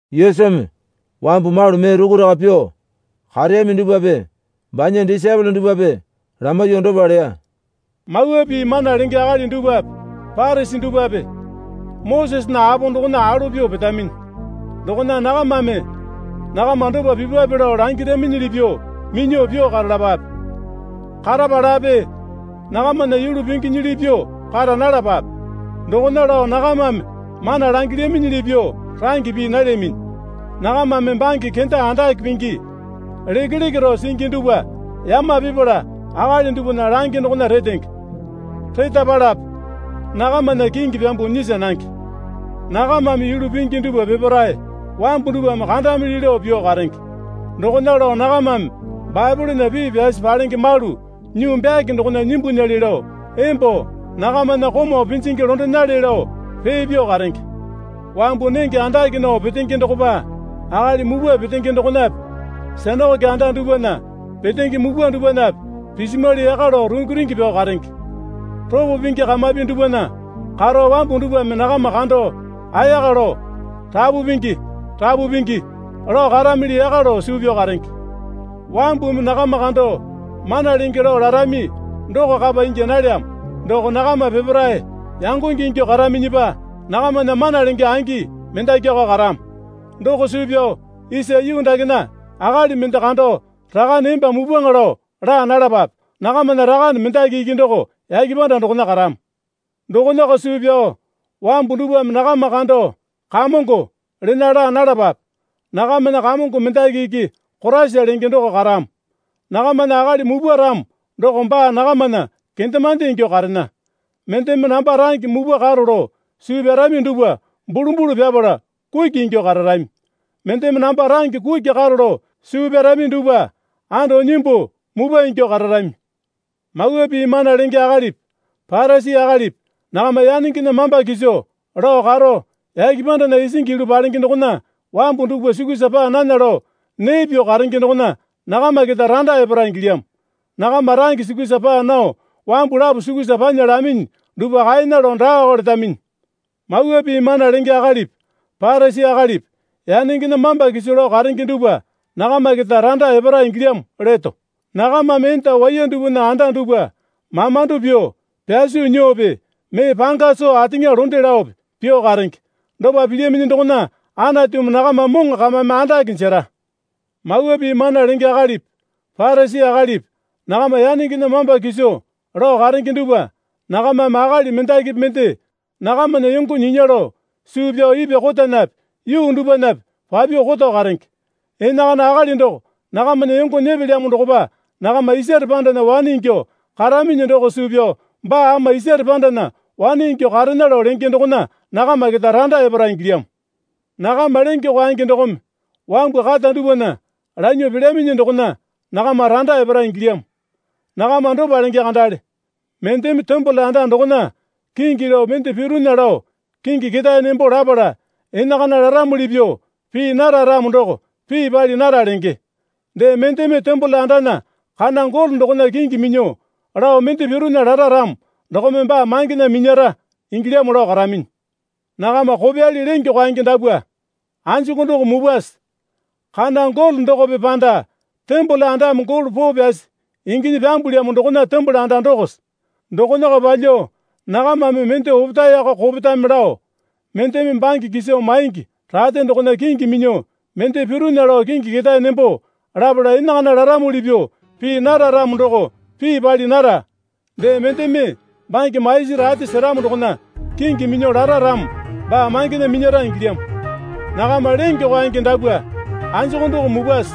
Yesumi wambu malu mee rukuraka pyuo kareyami dupwape banya disaepole dupwape lamaiyuo dopa leya. Mawa Pii mana lenge akali dupwape Parisi dupwape Mosesena apo dokona alo pyuo petaminyi. Dokona nakamame nakama dopa pipwape lao langiraminyili pyuo minyuo pyuo karalapape. Karapalape nakamana yulu pinginyili pyuo kara nalapape. Dokona lao nakamame mana langilyaminyili pyuo range pii nalyaminyi. Nakamame bange kenda andake pingi lekeleke rao singi dupwa yama pipala akali dupwana lange dokona retenge. Retapalape nakamana kingi pyambuo nyisa nange. Nakamame yulu pingi dupwa peparae wambu dupwame kandamili lao pyuo karenge. Dokona lao nakamame Baepolena pii pyasi palenge malu nyuu byake dokona nyimbunyale lao embo nakamana komau pinjingi londenale lao pee pyuo karenge. Wambu nenge andake nao petenge dokopa akali mupwa petenge dokonape sinakoke anda dupwana petenge mupwa dupwanape pisimwali yaka lao rungi rungi pyao karenge. Ropo pingi kamapi dupwana karo wambu dupwame nakama kando ayaka lao, Rapu Pingi, Rapu Pingi, lao karamili yaka lao suu pyao karenge. Wambumi nakama kando Mana Lenge lao larami doko kapa ingya nalyamo. Doko nakama peparae yangonge ingyuo karaminyipa nakamana mana lenge angi mendakiko karamo. Doko suu pyao isa yuu dakena akali mende kando rakane emba mupwaŋa lao laa nalapape. Nakamana Rakane mendaki iki doko yake panda dokona karamo. Dokonako suu pyao wambu dupwame nakama kando, Kamongo, lena laa nalapape. Nakamana Kamongo mendaki iki Koraisa lenge doko karamo. Nakamana akali mupwa ramo doko baa nakamana kendemande ingyuo karena. Mendeme namba range mupwa karo lao suu pyarami dupwa bulu bulu pyapala kuki ingyuo kararami. Mendeme namba range kuki karo lao suu pyarami dupwa anda nyimbuo mupwa ingyuo kararami. Mawa Pii mana lenge akalipi Parisi akalipi nakama yanengena mamba kiso lao karo yake pandana isingi yulu palenge dokona wambu dupwa sukusa paa nana lao nee pyuo karenge dokona nakama keta randa epara ingilyamo. Nakama range sukusa paa nao wambu lapo sukusa panya laminyi dupwa kaena lao daako letaminyi. Mawa Pii mana lenge akalipi Parisi akalipi yanengena mamba kiso lao karenge dupwa nakama keta randa epara ingilyamo leto. Nakamame enda waiya dupwana anda dupwa mamando pyuo pyaso nyuope mee panga soo ateŋa londe laope pyuo karenge. Dopa pilyaminyi dokona Anatumi nakama moŋo kamame andake jera. Mawa Pii mana lenge akalipi Parisi akalipi nakama yanengena mamba kiso lao karenge dupwa nakamame akali mendakipi mende nakamana yongo nyinya lao suu pyao ipwa kotanape yuu dupwanape papyuo koto karenge. Enakana akali doko nakamana yongo nyepelyamo dokopa nakama isare pandana wane ingyuo karaminyi doko suu pyao baa ama isare pandana wane ingyuo karena lao lenge dokona nakama keta randa epara ingilyamo. Nakama lenge kwaenge dokome wambu kata dupwana lanyuo pelyaminyi dokona nakama randa epara ingilyamo. Nakama dopa lenge kandale. Mendeme tembole anda dokona kingi lao mende pirunya lao kingi ketae nembo lapala enakana laramuli pyuo pii nara ramo doko pii pali nara lenge. Dee mendeme tembole andana kana golo dokona kingi minyuo lao mende pirunya lara ramo dokome baa mangena minyara ingilyamo lao karaminyi. Nakama kopyali lenge kwaenge dapwa. Anjuku doko mupwase? Kana golo dokope panda tembole andame golo poo pyasi inginyi pyambulyamo dokona tembole anda dokose? Dokonako palyuo nakamame mende opetaeko kopetame lao, mendeme bange kiso maingi rate dokona kingi minyuo mende pirunya lao kingi ketae nembo lapala enakana laramuli pyuo pii nara ramo doko pii pali nara. Dee mendeme bange maisi rate seramo dokona kingi minyuo lara ramo baa mangena minyara ingilyamo. Nakama lenge kwaenge dapwa anjuku doko mupwase?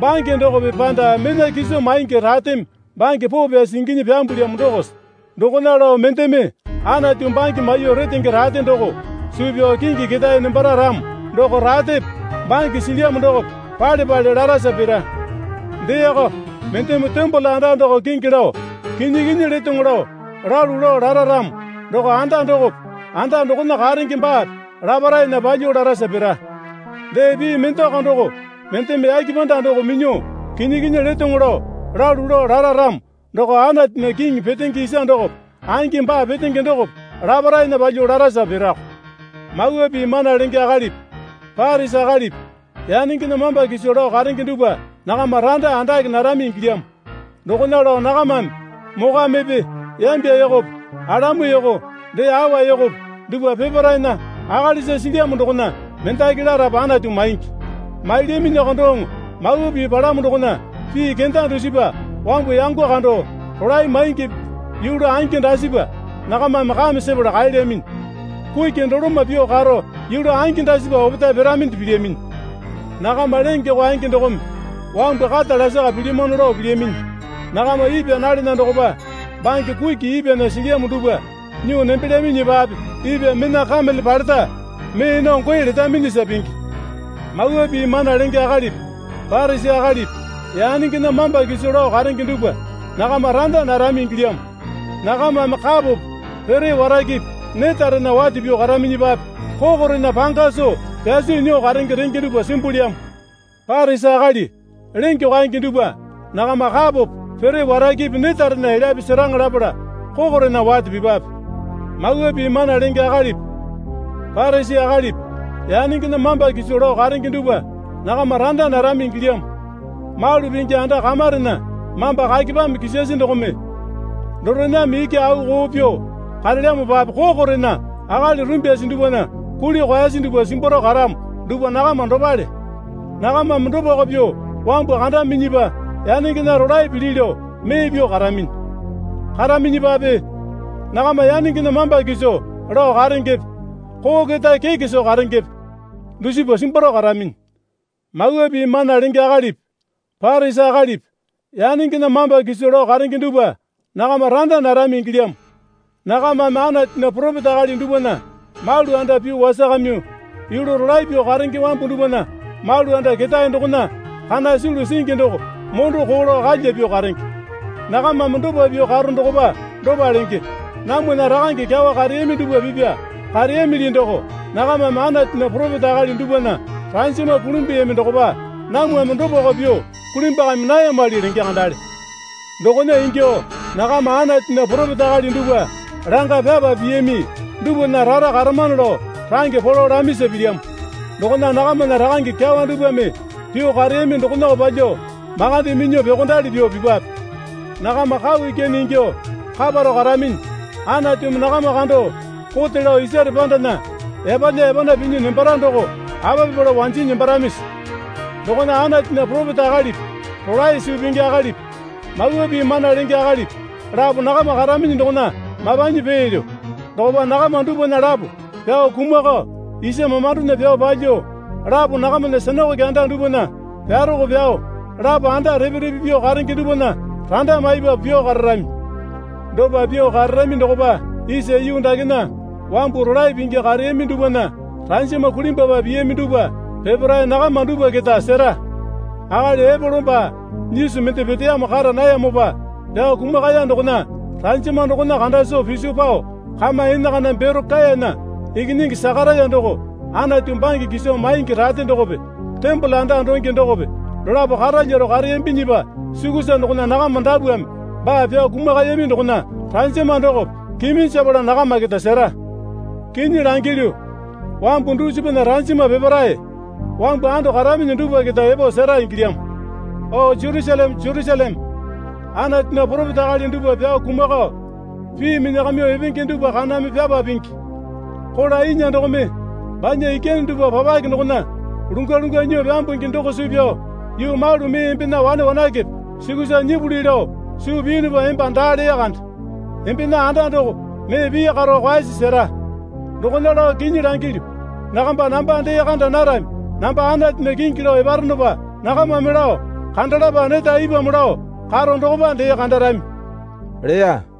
Bange dokope panda mena kiso maingi rateme bange poo pyasi inginyi pyambulyamo dokose? Dokona lao mendeme Anatu bange maiyuo retenge rate doko suu pyao kingi ketae nembara ramo doko ratepe bange silyamo dokope pale pale larasa pira. Deeko, mendeme tembole anda doko kingi lao kinyi kinyi letoŋo lao, lalu lao lara ramo doko anda dokope anda dokona karenge baape laparaena palyuo larasa pira. Dee pii mendeko doko, mendeme yake panda doko minyuo kinyi kinyi letoŋo lao lalu lao lara ramo doko Anatunya kiŋi petenge isa dokope angi baa petenge dokope laparaena palyuo larasa pirako. Mawa Pii mana lenge akalipi Parisi akalipi yanengena mamba kiso lao karenge dupwa nakama randa andake narami ingilyamo. Dokona lao nakamame mokwamepe yambya yokope alamu yoko dee awa yokope dupwa peparaena akalisa silyamo dokona mendaki larapu Anatu maingi. Mailyaminyiko doŋo Mawa Pii palamo dokona pii kenda dusipa wambu yango kando rolae maingipi yulu angi dasipa nakamame kame sepala kaelyaminyi. Kuki doloma pyuo karo yulu angi dasipa opetae piraminde pilyaminyi. Nakama lenge kwaenge dokome wambu kata lasaka pilyamano lao pilyaminyi. Nakama ipwa nalena dokopa bange kuki ipwana silyamo dupwa nyuo nembelyaminyipape ipwa mena kamele paleta mee nao goe letaminyisa pingi. Mawa Pii mana lenge akalipi Parisi akalipi yanengena mamba kiso lao karenge dupwa, nakama randa narami ingilyamo. Nakamame kapope pere warakepe netarena wate pyuo karaminyipape kokorena panga soo pyaso nyuo karenge renge dupwa simbulyamo. Parisi akali lenge kwaenge dupwa nakama kapope pere warakepe netarena elyape seraŋa lapala kokorena wate pipwape. Mawa Pii mana lenge akalipi Parisi akalipi yanengena mamba kiso lao karenge dupwa nakama randa narami ingilyamo. Malu pingi anda kamarena mamba kakepame kisasi dokome dorename iki au koo pyuo karelyamopape kokorena akali rumbyasi dupwana kuli kwaesi dupwa simbwaro karamo dupwa nakama dopale. Nakamame dopako pyuo wambu kandaminyipa yanengena rolae pili lao mee pyuo karaminyi. Karaminyipape nakama yanengena mamba kiso lao karengepe koo keta keke soo karengepe dusipa simbwaro karaminyi. Mawa Pii mana lenge akalipi Parisi akalipi yanengena mamba kiso lao karenge dupwa nakama randa narami ingilyamo. Nakamame Anatunya poropeta akali dupwana malu anda pyuo wasakamyuo yulu rolae pyuo karenge wambu dupwana malu anda ketae dokona kana sulu singi doko mondo koo lao kalya pyuo karenge. Nakamame dopa pyuo karo dokopa dopa lenge. Namwana rakange kyawa kareyami dupwa pipya kareyamili doko nakamame Anatunya poropeta akali dupwana ranjama kulimbuyami dokopa namwame dopako pyuo kulimbwakami nayamali lenge kandale. Dokona ingyuo nakama Anatunya poropeta akali dupwa langa pyapa piyami dupwana rara karamano lao range polo lamisa pilyamo. Dokona nakamana rakange kyawa dupwame pyuo kareyami dokonako palyuo makande minyuo pyuokondali pyuo pipwape. Nakama kau ikyane ingyuo kaparao karaminyi. Anatumi nakama kando kote lao isare pandana yapalya yapana pinyi nembara doko apa pipala wanjinyi nembaramisi? Dokona Anatunya poropeta akalipi rolae suu pingi akalipi mawa pii mana lenge akalipi lapo nakama karaminyi dokona mapanyi peelyo. Dokopa nakama dupwana lapo pyao kumakao isa mamandona pyao palyuo, lapo nakamana sinakoke anda dupwana pyarako pyao, lapo anda repe repe pyuo karenge dupwana randa maipapu pyuo kararami. Dopa pyuo kararami dokopa isa yuu dakena wambu rolae pingi kareyami dupwana ranjama kulimbwapa piyami dupwa peparae nakama dupwa keta sera. Akali Epolo baa nyisu mende peteyamo kara nayamopa pyao kumakaya dokona ranjama dokona kanda soo piso pao kama enakana Berokayana ikinyingi Sakaraya doko Anatu bange kiso maingi rate dokope tembole anda donge dokope dolapo karalyaro kareyambinyipa sukusa dokona nakama dapwame baa pyao kumakayami dokona ranjama dokope kiminjapala nakama keta sera. Kinyi langilyu, wambu dusipana ranjama peparae wambu ando karaminyi dupwa keta epo sera ingilyamo. O Jerusaleme, Jerusaleme, Anatunya poropeta akali dupwa pyao kumakao, pii minyakamyuo epenge dupwa kaname pyapa pingi. Kola inya dokome banya ikyane dupwa papaki dokona lungwa lungwa nyuo pyambungi doko suu pyao yuu malu mee embena wane wanakepe sukusa nyipuli lao suu piyunupa emba daa lee kande. Embena anda doko mee pii karo kwaesi sera. Dokona lao kinyi langilyu. Nakamba namba dee kanda narami. Namba Anatunya kingi lao eparonopa nakamame lao kandalapa neta ipwamo lao karo dokopa dee kandarami leya.